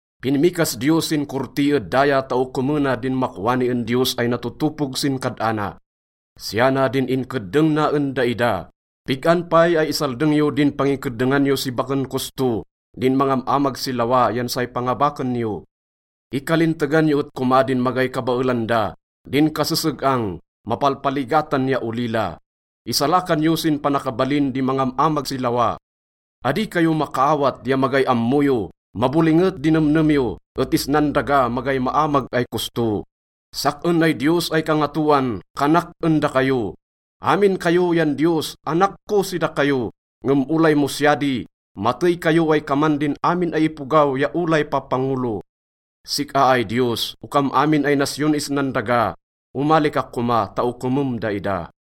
Pinmikas Diyos sin korti ed daya ta okomena din makwani en diyos ay natotopog sin kad-ana. Siya na din inkeddeng na en daida: “Pig-an pay ay isaldeng yo din pangikeddengan yo si baken kosto, din mangam-amag si lawa yan say pangabaken yo? Ikalintegan yo et koma din magay kabaelan da, din kaseseg-ang, mapalpaligatan, ya olila. Isalakan yo sin panakabalin di mangam-amag si lawa. Adi kayo makaawat ya magay ammo yo. Mabolinget di nemnem yo, et isnan daga, magay maamag ay kosto. Sak-en ay Diyos ay Kangatoan, kanak en dakayo: Amin kayo yan diyos, anak ko si dakayo, ngem olay mo siya di, matey kayo ay kaman din amin ay ipogaw ya olay papangolo.” Sik-a ay Diyos, okam amin ay nasyon isnan daga, omali ka koma ta okomem daida.